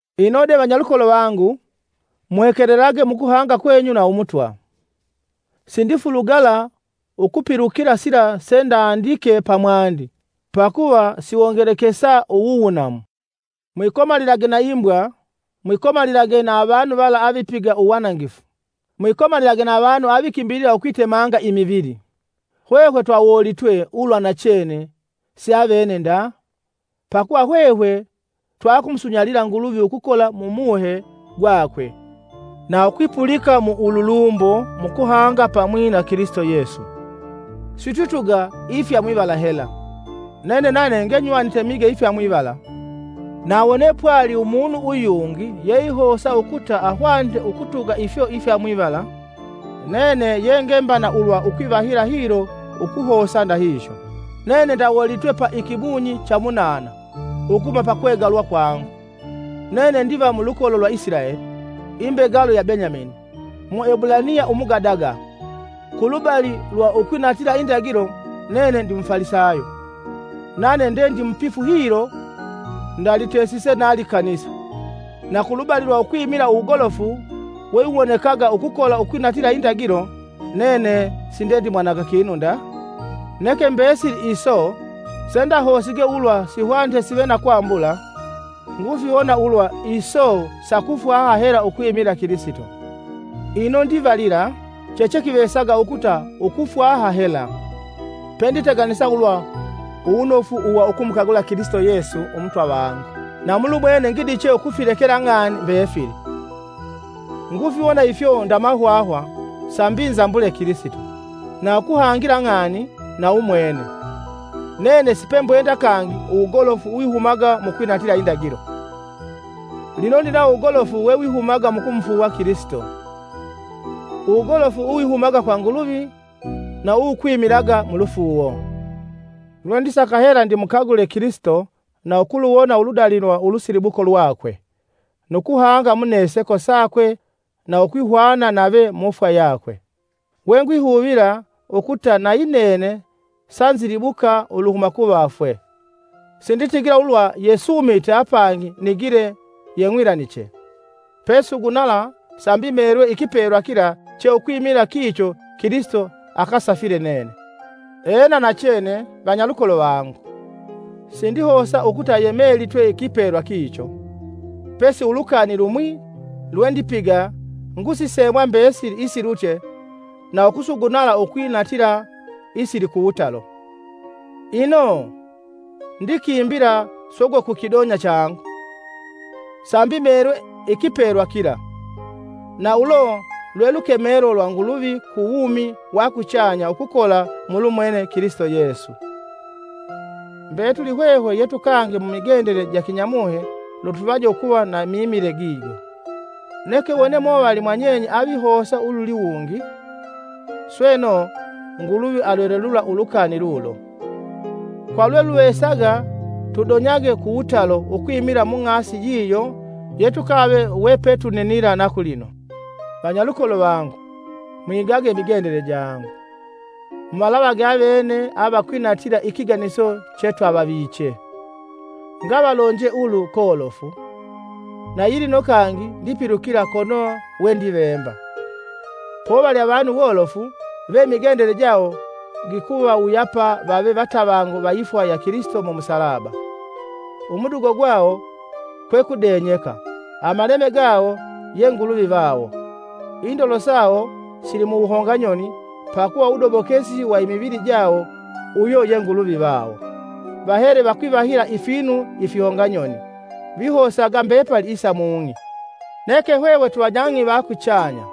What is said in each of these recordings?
Ino de, vanyalukolo vangu, muhekelelage mukuhanga kwenyu na Umutwa! Sindifulugala ukupilukila sila sendandike pamwandi pakuva siwongelekesa uwuwunamu. Mwikomalilage na imbwa mwikomalilage na avanu vala avipiga uwanangifu, mwikomalilage na avanu avikimbila ukwitemanga imivili. Hwehwe twawoolitwe ulwa nachene siavene nda, pakuva hwehwe twakumusunyalila Nguluvi ukukola mu muhe gwakwe na ukwipulika na ululumbo mukuhanga pamwi na Kilisito Yesu. Sitwituga ifya mwivala hela. Nene nane ngenywanite mige ifya mwivala; na wone pwali umunu uyungi yeihosa ukuta ahwanite ukutuga ifyo ifya mwivala, nene ye ngemba na ulwa kwivahila hilo ukuhosa ndahihyo; nene ndawoolitwe pa ikimunyi cha umunana ukuhuma pakwegalwa kwangu; nene ndiva mulukolo lwa Isilaeli, imbegalo ya Benyamini, Muebulaniya umugadaga. Kulubali lwa ukwinatila indagilo nene ndi Mufalisayo, nane nde ndimupifu hilo, ndalitesise na likanisa. Na kulubali lwa ukwimila uwugolofu wewiwonekaga ukukola ukwinatila indagilo, nene sindendimwananga kinu nda. Neke mbesili iso sendahosige ulwa sihwanite sive na kwambula, ngufiwona ulwa iso sa kufwaha hela ukwimila Kilisito. Ino ndivalila chechekivesaga ukuta ukufwaha hela, penditeganisa ulwa uwunofu uwa ulamukagula Kilisito Yesu Umutwa vangu. Na mulumwene ngidiche ukufilekela ng'ani mbefili, ngufiwona ifyo nda mahwahwa sambi nzambule Kilisito. na ukuhangila ng'ani na umwene. Nene sipembwenda kangi uwugolofu uwihumaga mukwinatila indagilo; lino ndinawo uwugolofu wawihumaga mukumufuuwa Kilisito; uwugolofu uwihumaga kwa Nguluvi na uwukwimilaga mulufuuwo. Lwendisaka hela ndimukagule Kilisito na ukuluwona uludali lwa ulusilibuko lwakwe, nu kuhanga muneseko sakwe na ukwihwana nave mufwa yakwe, we ngwihuvila ukuta nayi nene sanzilibuka uluhuma kuvafwe. Sinditigila ulwa yesuumite apangi nigile yeng'wilaniche. Pesugunala sambi meelwe ikipelwa kila che ukwimila kicho Kilisito akasafile nene. Ena nachene, Vanyalukolo vangu, sindihosa ukuta yemelitwe ikipelwa kicho, pesi ulukani lumwi lwendipiga ngusisemwa mbesili isilutye na ukusugunala ukwinatila isilikuwutalo. Ino, ndikimbila sogwe ku kidonya changu, sambi meelwe ikipelwa kila, na ulo lwe lukemelo lwa Nguluvi ku wumi wa kuchanya ukukola mulumwene Kilisito Yesu. Mbetuli hwehwe yetukange mumigendele ja kinyamuhe lutuvaje ukuva na mimile gijo. Neke wone movali mwanyenye avihosa ululiwungi, sweno, Nguluvi alwelelulila ulukani lulo. Kwa lweluvesaga tudonyage kuwutalo ukwimila mung'asi yiyo yetukave wepetuninila na kulino. Vanyalukolo vangu, mwigage ukwiga imigendele jangu. Muvalavage avene avakwinatila ikiganiso chetwavaviche. Ngavalonje ulu kolofu, nayilino kangi ndipilukila kono wendivemba: Povali avanu wolofu ve imigendele jawo gikuvawuyapa vave vatavangu vaifwa ya Kilisito mumusalaba. Umudugo gwawo, kwe kudenyeka, amaleme gawo ye nguluvi vawo, indolo sawo sili muwuhonga nyoni pakuva uwudobokesi wa imivili jawo uyo ye nguluvi vawo, vahele vakwihavila ifinu ifihonganyoni, vihosaga mbepali isa mung'i. Neke hwehwe twivanyang'i va kuchanya,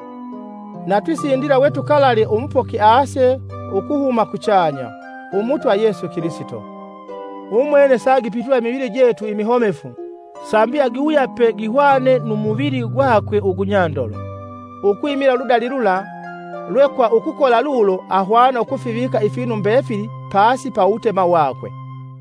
na tusindila we tukalalye umupoki ase ukuhuma kuchanya, Umutwa Yesu Kilisito. Umwene saagipitula imivili jetu imihomefu sambi agiwuyape gihwane nu muvili gwakwe ugunyandolo, ukwimila uludali lula lwe kwa ukukola lulo ahwana ukufivika ifinu mbefili pasi ya uwutema wakwe.